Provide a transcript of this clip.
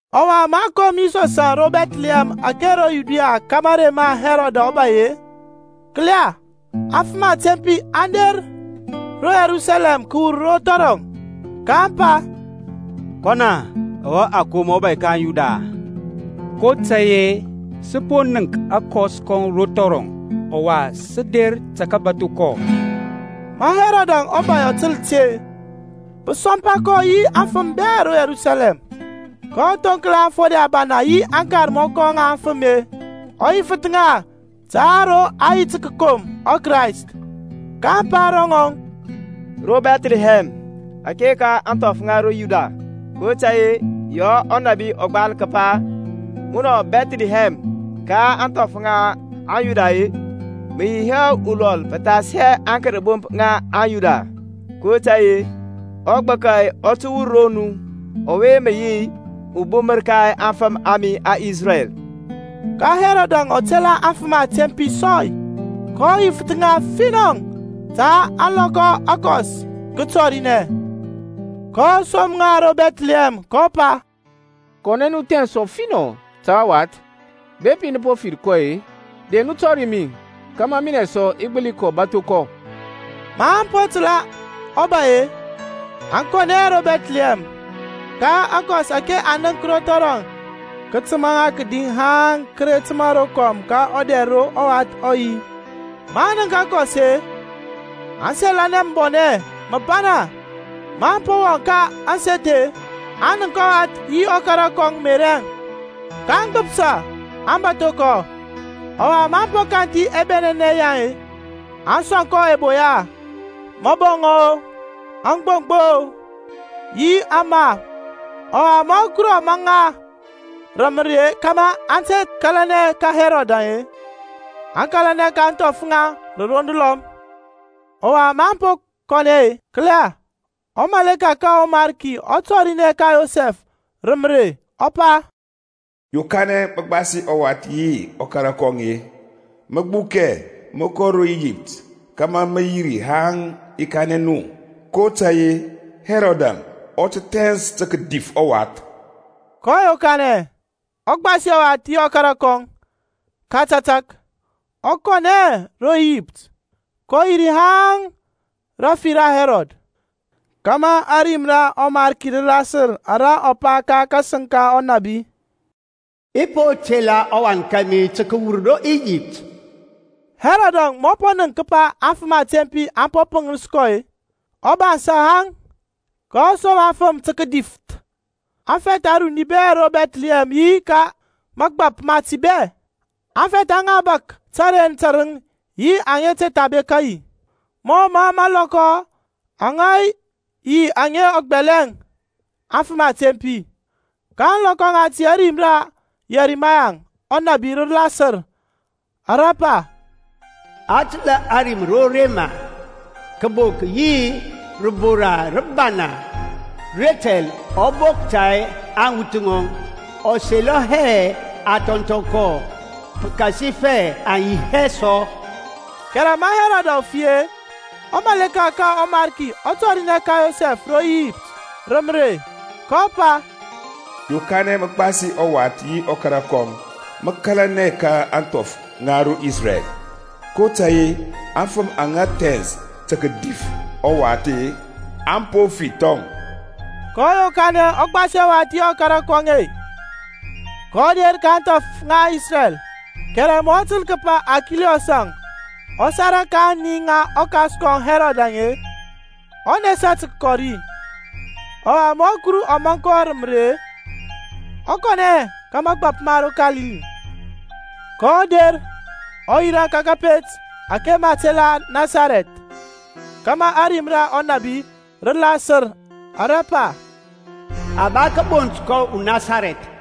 Ɔwa ma a kom Yisɔsȧŋ ro Bɛthlihɛm ȧke ro Yudia ka mȧrey ma Hɛrɔd ɔbay-e, kǝla, afǝm atempi aŋ der ro Yerusalɛm kǝyɛfȧ ro thɔrɔŋ, kaŋ pa, Kɔn-a ɔwe a kom ubȧy ka aŋYuda-a? kotȧy-e sǝ po nənk akɔs kɔŋ ro thɔrɔŋ, ɔwa sǝ der tǝ kǝbatho kɔ. Ma Herodȧŋ ɔbȧy ɔ tǝl ti-e, pǝ sɔmpa kɔ yi aŋfǝm bɛ ro Yerusalɛm. kɔ thoŋkla aŋfode ȧbana yi aŋkarmɔkɔ ŋa aŋfǝme, ɔ yifǝth ŋa ta ro a yi tǝ kǝkom ɔKrayst. kaŋ pa ro ŋɔŋ, Ro Bɛthlihɛm ȧke ka ȧŋthɔf ŋa ro Yudia; kotȧy-e yaŋ ɔnȧbi ɔ gbal kǝpa, Munɔ Bɛthlihɛm, ka ȧŋthɔf ŋa Yuda, Mǝ yi hɛ ulɔl pǝthas aŋkərbomp ŋa aŋ Yuda; kotȧy-e ugbǝkȧ ɔ tǝwur ro mu Ɔwe mǝ yi ɔbumǝr ka aŋfǝm a mi aŋIsrɛl. Ka Herodȧŋ ɔ tela aŋfǝm atempi sɔy, kɔ yifǝth ŋa finɔ ta ȧŋlɔkɔ aŋa akɔs kǝ tɔrinɛ. kɔ som ŋa ro Bɛthlihɛm, kɔ pa, Kɔnɛ nu, thɛns ɔfinɔ ta ɔwath. Bepi nǝ po fir kɔ-e, de nu tɔri mi, kȧmȧ minɛ sɔ i gbǝli kɔ bȧtho kɔ. Maŋ po tǝla ɔbay-e, aŋ kɔnɛ ro Bɛthlihɛm, ka akɔs ȧke aŋ nənk ro thɔrɔŋ kǝ tǝma ŋa kǝdi haŋ kǝ re tǝma rokɔm ka ɔdɛr ro ɔwath ɔ yi. Maŋ nənk akɔs-e, aŋ selanɛ mǝbɔnɛ mǝbana. Maŋ po wɔŋ ka ȧŋseth-e, aŋ nənk ɔwath yi ɔkara kɔŋ Meriȧŋ, kaŋ gbǝpsa, aŋ bȧtho kɔ. Ɔwa maŋ po kanthi ɛbɛnɛnɛ yaŋ-e, aŋ sɔŋ kɔ ɛboya; mǝbɔŋɔ-o, agboŋgbo-o yi aŋma. Ɔwa, ma Kuruȧŋ ɔ maŋ ŋa rǝ mǝrei kȧmȧ aŋ te kȧlanɛ ka Herod-e, aŋ kȧlanɛ ka ȧŋthɔf ŋaŋ rǝ roŋ dǝlɔm. Ɔwa maŋ po kɔnɛ-e, kǝla, umȧleka ka ɔMarki ɔ tɔrinɛ ka Yosɛf rǝ mǝrei, ɔ pa, Yokanɛ mǝ gbasi ɔwath yi ɔkara kɔŋ, mǝ gbukɛ mǝ kɔ ro Iyipt, kȧmȧ mǝ yi ri haŋ i kanɛ mu; kotȧy-e Herodȧŋ ɔ tǝ thɛns tǝ kǝdif ɔwath. kɔ yokanɛ, ɔ gbasi ɔwath yi ɔkara kɔŋ ka tȧtȧk, ɔ kɔnɛ ro Iyipt. kɔ yi ri haŋ rafi ra Hɛrɔd; kȧmȧ ȧrim ra ɔMarki rǝ lasǝr ara ɔ pa ka kasǝŋ ka ɔnȧbi, I po tela ɔwan kȧmi tǝ kǝwur ro Iyipt. Herodȧŋ, ma ɔ nənk kǝpa aŋfǝm atempi aŋ po pǝŋis kɔ-e, ɔ bansȧ haŋ, kɔ som afǝm tǝ kǝdifǝth aŋfɛth aruni bɛ ro Bɛthlihɛm yi ka mȧgbȧp mati bɛ, aŋfɛth aŋa bȧk tǝren tǝrǝŋ yi aŋa te tha bekȧ yi-e, mɔ mǝ ȧŋlɔkɔ aŋ yi aŋa ɔ gbɛlɛŋ aŋfǝm atempi. Ka ȧŋlɔkɔ ŋati ȧrim ra Yɛrimaya ɔnȧbi rǝ lasǝr, ara pa, A tǝla rim ro Rama, Kǝbok yi rǝbora rǝbana. Retɛl ɔ bok ta aŋwuth ŋɔŋ; Ɔ selɔ hɛ a thɔnthɔ kɔ, pǝkasifɛ aŋ yi hɛ sɔ. Kɛrɛ ma Herodȧŋ ɔ fi-e, umalek ka ɔMarki ɔ tɔrinɛ ka Yosɛf ro Iyipt rǝ mǝrey, kɔ pa, Yokanɛ mǝ gbasi ɔwath yi ɔkara kɔŋ, mǝ kȧlanɛ ka ȧŋthɔf ŋa Isrɛl, kotȧy-e aŋfǝm aŋa thɛns tǝ kǝdif ɔwath-e aŋ po fi thɔŋ. Kɔ yokanɛ ɔ gbasi ɔwath yi ɔkara kɔŋ-e, kɔ der ka ȧŋthɔf ŋa Isrɛl. Kɛrɛ ma ɔ tǝl kǝpa Arkiliyɔsȧŋ ɔ sara ka aŋni ŋa ɔkas kɔŋ Herod-e, ɔ nesa tǝ kǝkɔ ri. Ɔwa ma Kuru ɔ maŋ kɔ rǝ mǝrey-e, ɔ kɔnɛ ka mȧgbȧp ma ro Kalili. kɔ der, ɔ yirȧ ka kȧpet ȧke ma tela Nasarɛth; kȧmȧ ȧrim ra ɔnȧbi rǝ lasǝr ara pa, A ba kǝbont kɔ uNasarɛth.